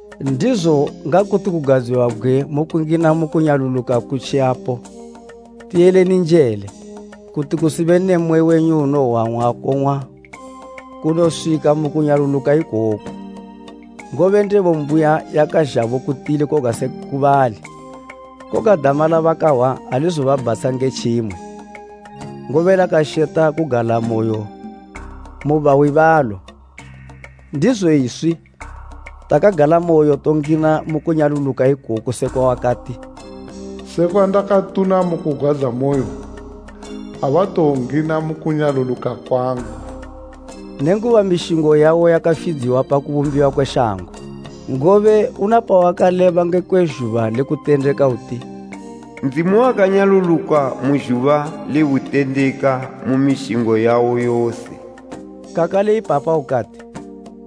Ndizo ngakuti kugadziwabgwe mukungina mu kunyaluluka kutjiyapo, tiyeleni njele, kuti kusibe ne mmwe wenyu unowowang'wa akong'wa kunoswika mu kunyaluluka ikoko. Ngobe ndebo mbuya yakazhabo ku tili koga se ku bali, koga dama labakahwa alizobabhatsha nge tjimwe, ngobe lakasheta kugalamoyo mu bahwi balo. Ndizo iswi takagalamoyo tongina mu kunyaluluka ikoko sekwa wakati, “Sekwa ndakatuna mu kugwadzamoyo, ‘Abatowongina mu kunyaluluka kwangu,’” nenguba mishingo yawo yakafidziwa pa kubumbiwa kwe shango. Ngobe una pawakaleba ngekwe zhuba le kutendeka uti, “Ndzimu wakanyaluluka mu zhuba le butendeka mu mishingo yawo yose.” Kakale ipapa ukati,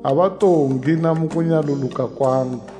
“Abatowongina mu kunyaluluka kwangu.”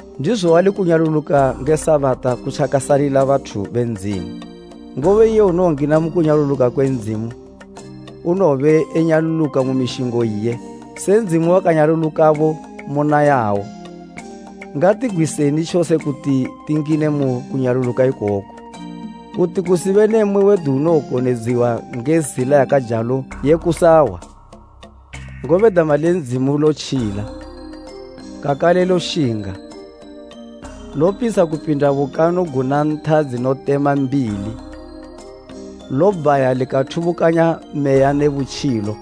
Ndizo wali kunyaluluka nge Sabata kutjakasalila bathu be Ndzimu; ngobe iye unowongina mu kunyaluluka kwe Ndzimu, unowobe enyaluluka mu mishingo iye, se Ndzimu wakanyalulukabo muna yawo. Ngatigwiseni tjose kuti tingine mu kunyaluluka ikoko, kuti kusibe ne mmwe wedu unowokonedziwa nge zila yakajalo ye kusahwa. Ngobe dama le Ndzimu lotjila, kakale loshinga, lopitsha kupinda bukanu guna ntha dzinotema mbili, lobhaya likathubukanya meya ne butjilo,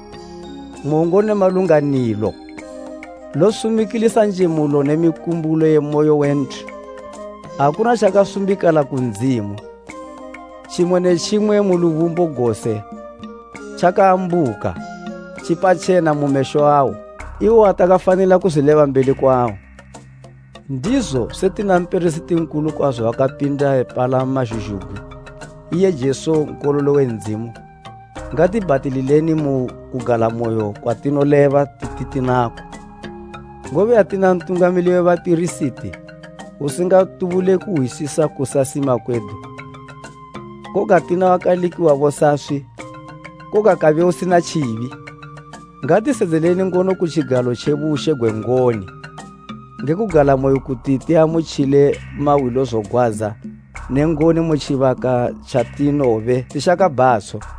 mongo ne malunganilo. Losumikilisa njemulo ne mikumbulo ye moyo we nthu. Akuna tjakasumbikala ku Ndzimu, tjimwe ne tjimwe mu lubumbo gose tjakaambuka, tjipatjena mu mesho awo, iwo watakafanila kuzwileba mbeli kwawo. Ndizo setina mpirisiti nkulu kwazo wakapinda epalama zhuzhugwi, iye Jesu Nkololo we Ndzimu, ngati bhatilileni mu kugalamoyo kwatinoleba titi tinako. Ngobe atina mpirisiti nkulu usingatubule kuhwisisa kusasima kwedu, koga tina wakalikiwabo saswi, koga kabe usina tjibi. Ngatisedzeleni ngono ku tjigalo tje bushe gwe ngoni, nge kugalamoyo kuti tiamutjile mahwilozogwadza ne ngoni mu tjibaka tjatinowobe tishaka bhatsho.